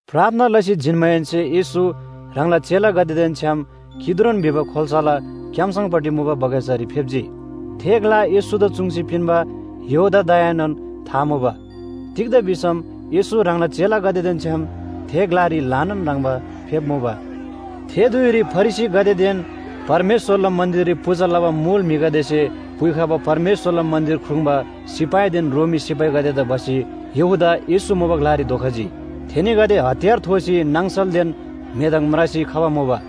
प्रार्थना लसी जिन्‍माहेन्‍से येशू ह्राङला चेलागदेदेन छ्‌याम किद्रोन भिबा खोल्‍साला क्‍याम्‍सङपट्टि मुबा बगैँचारी फेप्‍जी। थे ग्‍ला येशूदा चुङ्सी पिन्‍बा यहूदादाएनोन था मुबा। तिग्‍दा भिसम येशू ह्राङला चेलागदेदेन छ्‌याम थे ग्‍लारी ल्‍हानान ह्रङ्‌बा फेप्‍मुबा। थे धुइरी फरिसीगदेदेन परमेश्‍वरला मन्‍दिररी पूजा लबा मुल म्‍हिगदेसे पुइखबा परमेश्‍वरला मन्‍दिर ख्रुङ्बा सिपाहीदेन रोमी सिपाहीगदेदा भसी यहूदा येशू मुबा ग्‍लारी धोखजी। थेनीगदे हतियार थोसी नाङसलदेन मेदङ म्रासी खबा मुबा।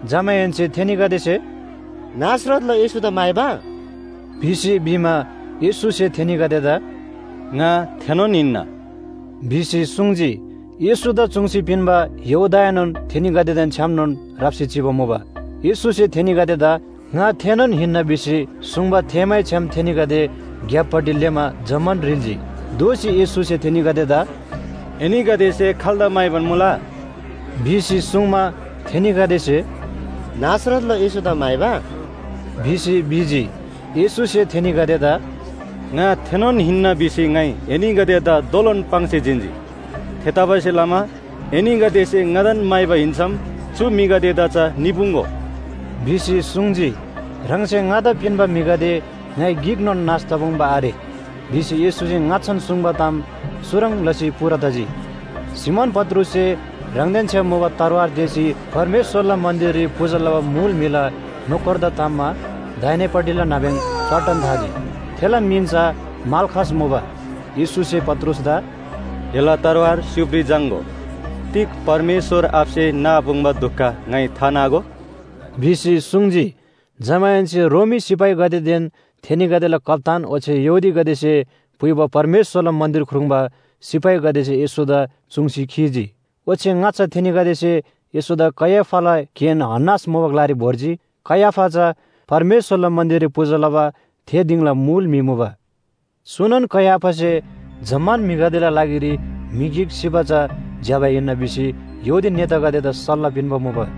जमाहेन्‍से थेनीगदेसे “नासरतला येशूदा म्‍हाइबा” भिसी भिमा, येशूसे थेनीगदेदा “ङा थेनोन हिन्‍ना” भिसी सुङ्जी। येशूदा चुङ्सी पिन्‍बा यहूदाएनोन थेनीगदेदेन छ्‌यामनोन राप्‍सी चिबा मुबा। येशूसे थेनीगदेदा “ङा थेनोन हिन्‍ना” भिसी सुङ्बा थेःमैछ्‌याम थेनीगदे ग्‍यापपट्टि लेःमा जम्‍मान ह्रिल्‍जी। दोःसी येशूसे थेनीगदेदा “एनीगदेसे खाल्‍दा म्‍हाइबान मुला?” भिसी सुङ्मा, थेनीगदेसे “नासरतला येशूदा म्‍हाइबा” भिसी भिजी। येशूसे थेनीगदेदा “ङा थेनोन हिन्‍ना भिसी ङाइ एनीगदेदा दोलोन पाङ्सी जिन्‍जी। थेतबासेलमा एनीगदेसे ङादान म्‍हाइबा हिन्‍सम चु म्‍हिगदेदा चा निपुङ्‍गो” भिसी सुङ्जी। “ह्राङसे ङादा पिन्‍बा म्‍हिगदे ङाइ गिकनोन नाश तपुङ्बा आरे” भिसी येशूसे ङाच्‍छान सुङ्बा ताम चुह्रङ् लसी पूरा तजी। सिमोन पत्रुससे ह्राङदेन छ्‌याम मुबा तरवार तेःसी परमेश्‍वरला मन्‍दिररी पूजा लबा मुल म्‍हिला नोकरदा ताम्‍मा दाहिनेपट्टिला नाब्‍यङ च्‍वाट्टन थाजी। थेला मिन चा माल्‍खस मुबा। येशूसे पत्रुसदा “एला तरवार स्‍युबारी झाङ्‍गो। तिग परमेश्‍वर आबासे नापुङ्बा दुख ङाइ थानागो?” भिसी सुङ्जी। जमाहेन्‍से रोमी सिपाहीगदेदेन थेनीगदेला कप्‍तान ओच्‍छे यहूदीगदेसे पुइबा परमेश्‍वरला मन्‍दिर ख्रुङ्बा सिपाहीगदेसे येशूदा चुङ्सी खीजी। ओच्‍छे ङाच्‍छा थेनीगदेसे येशूदा कैयाफाला केन हन्‍नास मुबा ग्‍लारी भोर्जी। कैयाफा चा परमेश्‍वरला मन्‍दिररी पूजा लबा थे दिङला मुल म्‍हि मुबा। चुनोन कैयाफासे “जम्‍मान म्‍हिगदेला लागिरी म्‍हि गिक सिबा चा ज्‍यबा हिन्‍ना” भिसी यहूदी नेतागदेदा सल्‍लाह पिन्‍बा मुबा।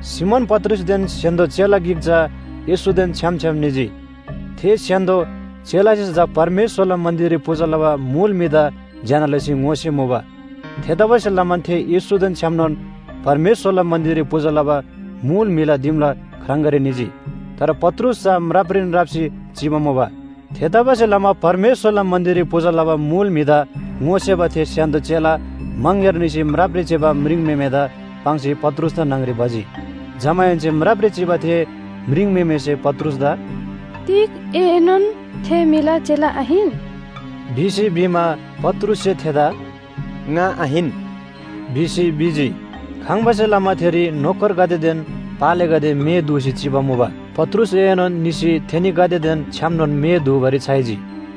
सिमोन पत्रुसदेन स्‍य्‍हान्‍दो चेला गिक चा येशूदेन छ्‌याम छ्‌याम निजी। थे स्‍य्‍हान्‍दो चेलासे चा परमेश्‍वरला मन्‍दिररी पूजा लबा मुल म्‍हिदा ज्‍यना लसी ङोसेमुबा। थेतबासेलमा थे येशूदेन छ्‌यामनोन परमेश्‍वरला मन्‍दिररी पूजा लबा मुल म्‍हिला दिमला ख्राङगारी निजी। तर पत्रुस चा म्रापरीन राप्‍सी चिबा मुबा। थेतबासेलमा परमेश्‍वरला मन्‍दिररी पूजा लबा मुल म्‍हिदा ङोसेबा थे स्‍य्‍हान्‍दो चेला मङग्‍यार निसी म्रापरी चिबा म्रिङम्‍हेमेदा पाङ्सी पत्रुसदा न्‍हङ‍री भजी। जमाहेन्‍से म्रापरी चिबा थे म्रिङम्‍हेमेसे पत्रुसदा “तिग एएनोन थे म्‍हिला चेला आहिन?” भिसी भिमा, पत्रुससे थेदा “ङा आहिन” भिसी भिजी। खङ्बासे लमा थेरी नोकरगदेदेन पालेगदे मे दूसी चिबा मुबा। पत्रुसएनोन निसी थेनीगदेदेन छ्‌यामनोन मे दूबारी छ्‌याइजी।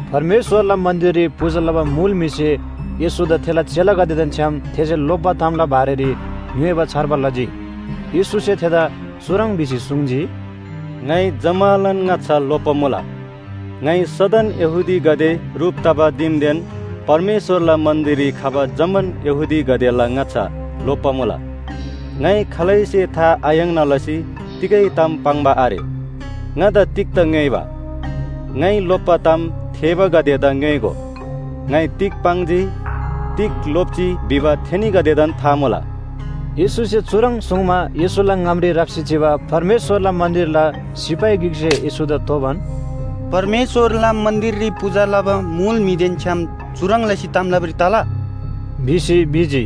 परमेश्‍वरला मन्‍दिररी पूजा लबा मुल म्‍हिसे येशूदा थेला चेलागदेदेन छ्‌याम थेसे लोप्‍बा तामला बारेरी ङ्‌योइबा छार्बा लजी। येशूसे थेदा चुह्रङ् भिसी सुङ्जी, “ङाइ जम्‍मालान ङाच्‍छा लोप्‍बा मुला। ङाइ सदन यहूदीगदे ह्रुप तबा दिमदेन परमेश्‍वरला मन्‍दिररी खबा जम्‍मान यहूदीगदेला ङाच्‍छा लोप्‍बा मुला। ङाइ खालैसे था आयाङ्ना लसी तिगै ताम पाङ्बा आरे। ङादा तिग्‍दा ङ्‌योइबा? ङाइ लोप्‍बा ताम थेःबागदेदा ङ्‌योइगो। ङाइ तिग पाङ्जी, तिग लोप्‍जी भिबा थेनीगदेदान था मुला।” येशूसे चुह्रङ् सुङ्मा येशूला ङामरी राप्‍सी चिबा परमेश्‍वरला मन्‍दिरला सिपाही गिकसे येशूदा तोबान, “परमेश्‍वरला मन्‍दिररी पूजा लबा मुल म्‍हिदेन छ्‌याम चुह्रङ् लसी ताम लबारी तला?” भिसी भिजी।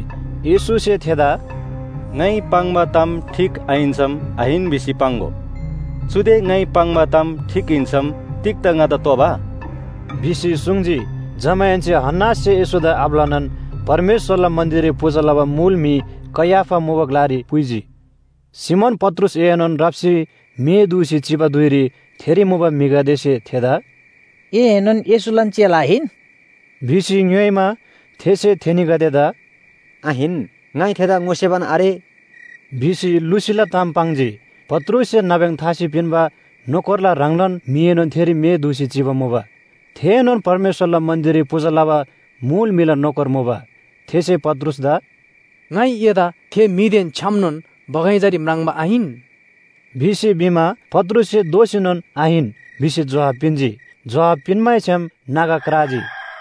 येशूसे थेदा “ङाइ पाङ्बा ताम ठीक आहिन्‍सम आहिन भिसी पाङ्‍गो। चुदे ङाइ पाङ्बा ताम ठीक हिन्‍सम तिग्‍दा ङादा तोबा?” भिसी सुङ्जी। जमाहेन्‍से हन्‍नाससे येशूदा आब्‍लानान परमेश्‍वरला मन्‍दिररी पूजा लबा मुल म्‍हि कैयाफा मुबा ग्‍लारी पुइजी। सिमोन पत्रुसएनोन राप्‍सी मे दूसी चिबा धुइरी थेरी मुबा म्‍हिगदेसे थेदा “एएनोन येशूलान चेला आहिन?” भिसी ङ्‌योइमा, थेसे थेनीगदेदा “आहिन, ङाइ थेदा ङोसेबान आरे” भिसी लुसीला ताम पाङ्जी। पत्रुससे नाब्‍यङ थासी पिन्‍बा नोकरला ह्राङलान म्‍हिएनोन थेरी मे दूसी चिबा मुबा। थेएनोन परमेश्‍वरला मन्‍दिररी पूजा लबा मुल म्‍हिला नोकर मुबा। थेसे पत्रुसदा “ङाइ एदा थे म्‍हिदेन छ्‌यामनोन बगैँचारी म्राङ्बा आहिन?” भिसी भिमा, पत्रुससे दोःसीनोन आहिन, भिसी जोहाब पिन्‍जी। जोहाब पिन्‍मैछ्‌याम नागा क्राजी।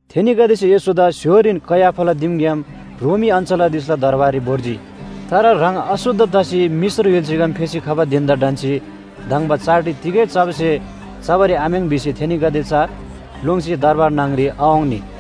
थेनीगदेसे येशूदा स्‍य्‍होरीन कैयाफाला दिमग्‍याम रोमी अञ्‍चलाधीशला दरबाररी भोर्जी। तर ह्राङ अशुद्ध तसी मिश्र य्‍हुल्‍साग्‍याम फेसी खबा धिन‍दा ढन्‍सी धङ्बा चाडरी तिगै चबा स्‍हे चबारी आम्‍याङ् भिसी थेनीगदे चा लोङ्सी दरबार न्‍हङ‍री आवाङ्नी।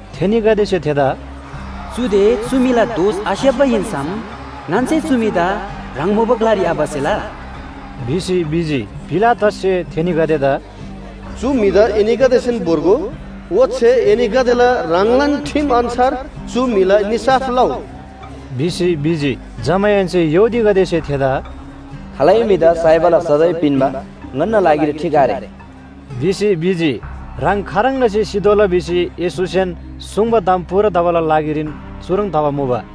थेनीगदेसे थेदा “चुदे चु म्‍हिला दोष आस्‍याप्‍बा हिन्‍सम ङन्‍से चु म्‍हिदा ह्राङ मुबा ग्‍लारी आभसेला” भिसी भिजी। पिलातससे थेनीगदेदा “चु म्‍हिदा एनीगदेसेन भोर्गो, ओच्‍छे एनीगदेला ह्राङलान ठिम अन्‍छार चु म्‍हिला निसाफ लउ” भिसी भिजी। जमाहेन्‍से यहूदीगदेसे थेदा “खालै म्‍हिदा साइबाला सजाय पिन्‍बा ङन्‍ना लागिरी ठीक आरे” भिसी भिजी। ह्राङ खाह्रङ् लसी सितोःला भिसी येशूसेन सुङ्बा ताम पूरा तबाला लागिरीन चुह्रङ् तबा मुबा।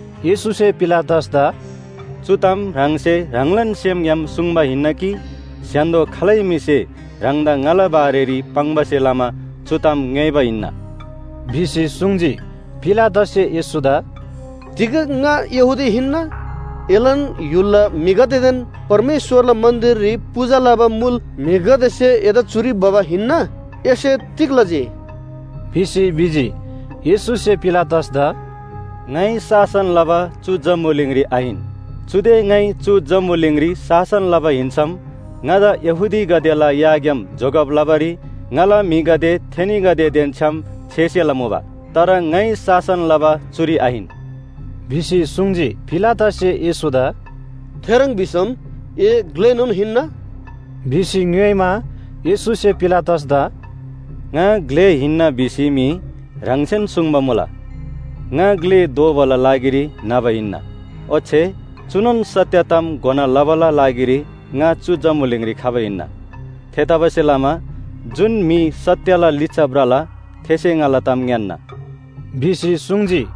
येशूसे पिलातसदा “चु ताम ह्राङसे ह्राङलान सेमग्‍याम सुङ्बा हिन्‍ना कि स्‍य्‍हान्‍दो खालै म्‍हिसे ह्राङदा ङाला बारेरी पाङ्बासे लमा चु ताम ङ्‌योइबा हिन्‍ना?” भिसी सुङ्जी। पिलातससे येशूदा “तिग ङा यहूदी हिन्‍ना? एलान य्‍हुलला म्‍हिगदेदेन परमेश्‍वरला मन्‍दिररी पूजा लबा मुल म्‍हिगदेसे एदा चुरी भबा हिन्‍ना। एसे तिग लजी?” भिसी भिजी। येशूसे पिलातसदा “ङाइ शासन लबा चु जम्‍बुलिङरी आहिन। चुदे ङाइ चु जम्‍बुलिङरी शासन लबा हिन्‍सम ङादा यहूदीगदेला याग्‍याम जोगब लबारी ङाला म्‍हिगदे थेनीगदेदेन छ्‌याम छेसेला मुबा। तर ङाइ शासन लबा चुरी आहिन” भिसी सुङ्जी। पिलातससे येशूदा “थेह्रङ् भिसम ए ग्‍लेनोन हिन्‍ना?” भिसी ङ्‌योइमा, येशूसे पिलातसदा “ङा ग्‍ले हिन्‍ना भिसी मी ह्राङसेन सुङ्बा मुला। ङा ग्‍ले दोबाला लागिरी न्‍हबा हिन्‍ना, ओच्‍छे चुनोन सत्‍य ताम घोना लबाला लागिरी ङा चु जम्‍बुलिङरी खबा हिन्‍ना। थेतबासेलमा जुन म्‍हि सत्‍यला लिच्‍छा भ्रला थेसे ङाला ताम ङ्‌यान्‍ना” भिसी सुङ्जी।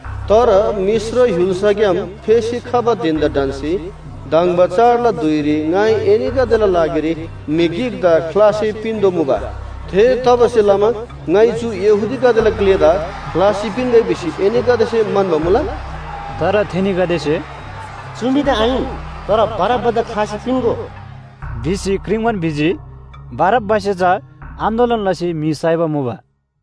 तर मिश्र य्‍हुल्‍साग्‍याम फेसी खबा धिन‍दा ढन्‍सी धङ्बा चाडला धुइरी ङाइ एनीगदेला लागिरी म्‍हि गिकदा ख्‍लासी पिन्‍तोःमुबा। थेतबासेलमा ङाइ चु यहूदीगदेला ग्‍लेदा ख्‍लासी पिन्‍गै भिसी एनीगदेसे म्‍हन्‍बा मुला?” तर थेनीगदेसे “चु म्‍हिदा आहिन, तर बारब्‍बादा ख्‍लासी पिन्‍गो” भिसी क्रिङ्बान भिजी। बारब्‍बासे चा आन्‍दोलन लसी म्‍हि साइबा मुबा।